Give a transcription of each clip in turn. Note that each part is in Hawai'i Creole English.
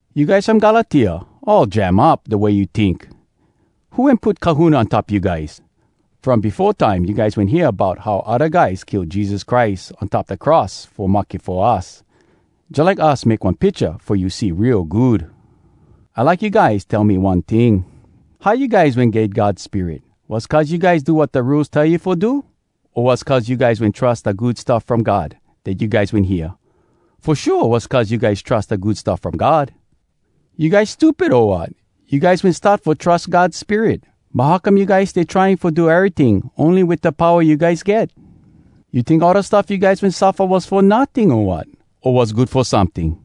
You guys from Galatia, all jam up, da way you tink! Who wen put kahuna on top you guys?! From befo time you guys wen hear bout how odda guys kill Jesus Christ on top da cross fo mahke fo us, jalike us make one picha fo you see real good. I like you guys tell me one ting: How you guys wen get God Spirit? Was cuz you guys do wat da Rules tell you fo do?! O was cuz you guys wen trus da Good Stuff From God dat you guys wen hear? Fo shua, was cuz you guys trus da Good Stuff From God! You guys stupid, o wat? You guys wen start fo trus God Spirit. But how come you guys stay trying fo do eryting ony wit da powa you guys get? You tink all da stuff you guys wen suffa was fo notting, o wat?! O was good fo someting?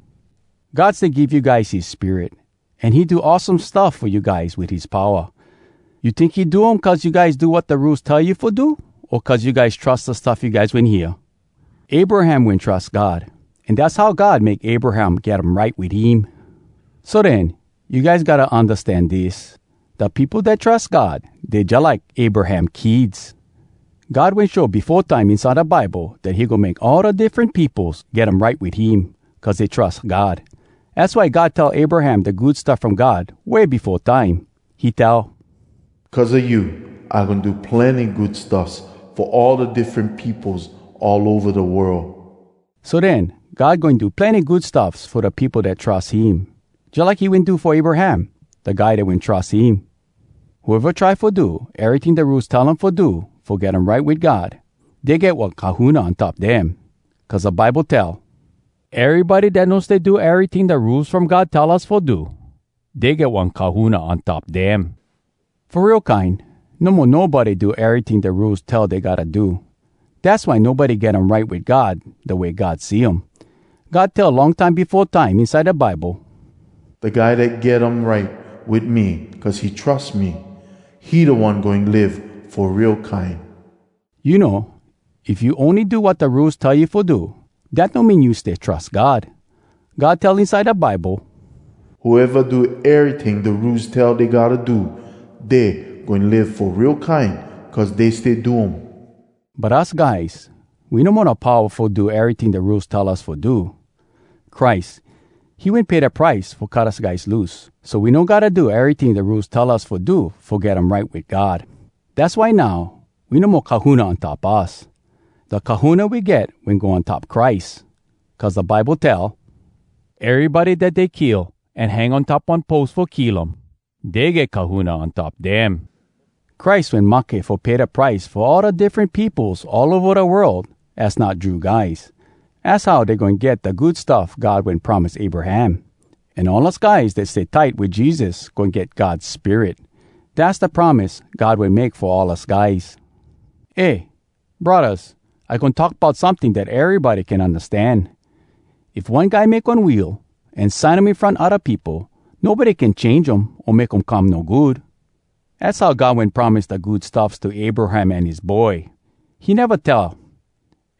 God stay give you guys his Spirit, an he do awesome stuff fo you guys wit his powa. You tink he do um cuz you guys do wat da Rules tell you fo do, o cuz you guys trus da stuff you guys wen hear? Abraham wen trus God, an dass how God make Abraham get um right wit him. So den, you guys gotta undastan dis: Da peopo dat trus God, dey jalike Abraham kids. God wen show befo time inside da Bible dat he goin make all da diffren peopos get um right wit him cuz dey trus God. Az why God tell Abraham da Good Stuff From God way befo time. He tell: “Cuz a you, I goin do plenny good stuffs fo all da diffren peopos all ova da world.” So den, God goin do plenny good stuffs fo da peopo dat trus him, jalike he wen do fo Abraham, da guy dat wen trus him. Whoeva try fo do eryting da Rules tell um fo do fo get um right wit God, dey get one kahuna on top dem. Cuz da Bible tell, “Erybody dat no stay do eryting da Rules From God tell us fo do, dey get one kahuna on top dem.” Fo real kine, no mo nobody do eryting da Rules tell dey gotta do. Dass why nobody get um right wit God da way God see um. God tell long time befo time inside da Bible, “Da guy dat get um right wit me cuz he trus me, he da one goin live fo real kine.” You know, if you ony do wat da Rules tell you fo do, dat no mean you stay trus God. God tell inside da Bible, “Whoeva do eryting da Rules tell dey gotta do, dey goin live fo real kine cuz dey stay do um.” But us guys, we no mo da powa fo do eryting da Rules tell us fo do. Christ, he wen pay da price fo cut us guys loose, so we no gotta do eryting da Rules tell us fo do fo get um right wit God. Dass why now, we no mo kahuna on top us. Da kahuna we get wen go on top Christ, cuz da Bible tell, “Erybody dat dey kill an hang on top one pos fo kill um, dey get kahuna on top dem.” Christ wen mahke fo pay da price fo all da diffren peopos all ova da world az not Jew guys. Az how dey goin get da good stuff God wen promise Abraham. An all us guys dat stay tight wit Jesus goin get God Spirit. Dass da promise God wen make fo all us guys. Eh, braddahs, I goin talk bout someting dat erybody can undastan. If one guy make one will an sign um in front odda peopo, nobody can change um o make um come no good. Az how God wen promise da good stuffs to Abraham an his boy. He neva tell,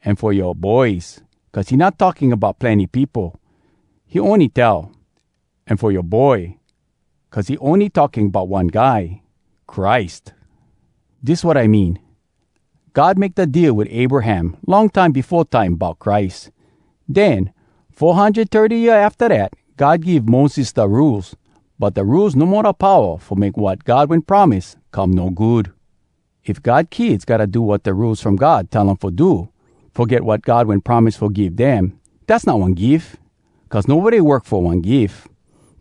“an fo yoa boys,” cuz he not talking bout plenny peopo. He ony tell, “an fo yoa boy,” cuz he ony talking bout one guy, Christ. Dis wat I mean. God make da deal wit Abraham long time befo time bout Christ. Den, four hundred thirty year afta dat, God give Moses da Rules. But da Rules no mo da powa fo make wat God wen promise come no good. If God kids gotta do wat da Rules From God tell um fo do, fo get wat God wen promise fo give dem, dass not one gif! Cuz nobody work fo one gif.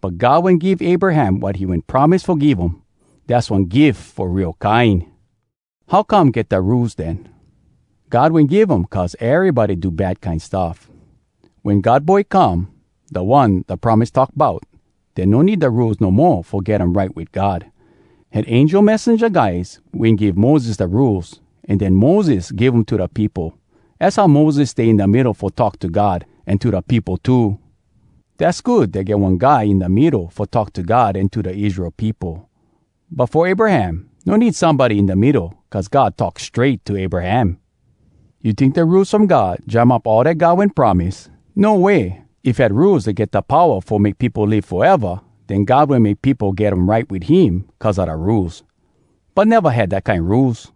But God wen give Abraham wat he wen promise fo give um. Dass one gif fo real kine! How come get da Rules, den? God wen give um cuz erybody do bad kine stuff. Wen God Boy come, da One da promise talk bout, den no need da Rules no mo fo get um right wit God. Had angel messenja guys wen give Moses da Rules, an den Moses give um to da peopo. Az how Moses stay in da middo fo talk to God an to da peopo too. Dass good dat get one guy in da middo fo talk to God an to da Israel peopo. But fo Abraham, no need somebody in da middo cuz God talk strait to Abraham. You tink da Rules From God jam up all dat God wen promise? No way! If had rules dat get da powa fo make peopo live foeva, den God wen make peopo get um right wit him cuz a da rules. But neva had dat kine rules.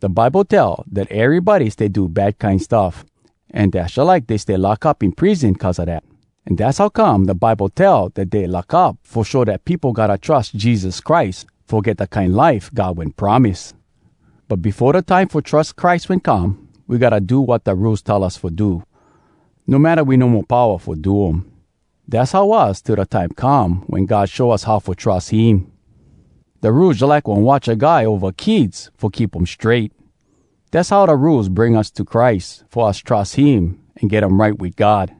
Da Bible tell dat erybody stay do bad kine stuff an dass jalike dey stay lock up in prison cuz a dat. An dass how come da Bible tell dat dey lock up fo show dat peopo gotta trus Jesus Christ, fo get da kine life God wen promise. But befo da time fo trus Christ wen come, we gotta do wat da Rules tell us fo do, no matta we no mo powa fo do um. Dass how was till da time come wen God show us how fo trus him. Da Rules jalike one watcha guy ova kids fo keep um strait. Dass how da Rules bring us to Christ fo us trus him an get um right wit God.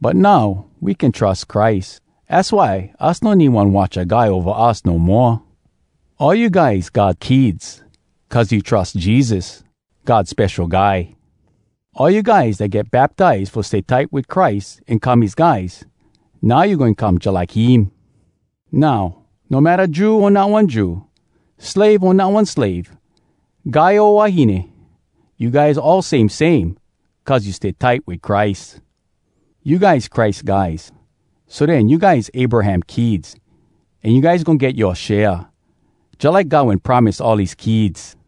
But now we can trus Christ, az why us no need one watcha guy ova us no moa. All you guys God kids cuz you trus Jesus, God Spesho Guy. All you guys dat get baptize fo stay tight wit Christ an come his guys, now you goin come jalike him. Now, no matta Jew o not one Jew, slave o not one slave, guy o wahine, you guys all same same cuz you stay tight wit Christ. You guys Christ guys, so den you guys Abraham kids. An you guys goin get yoa share, jalike God wen promise all his kids.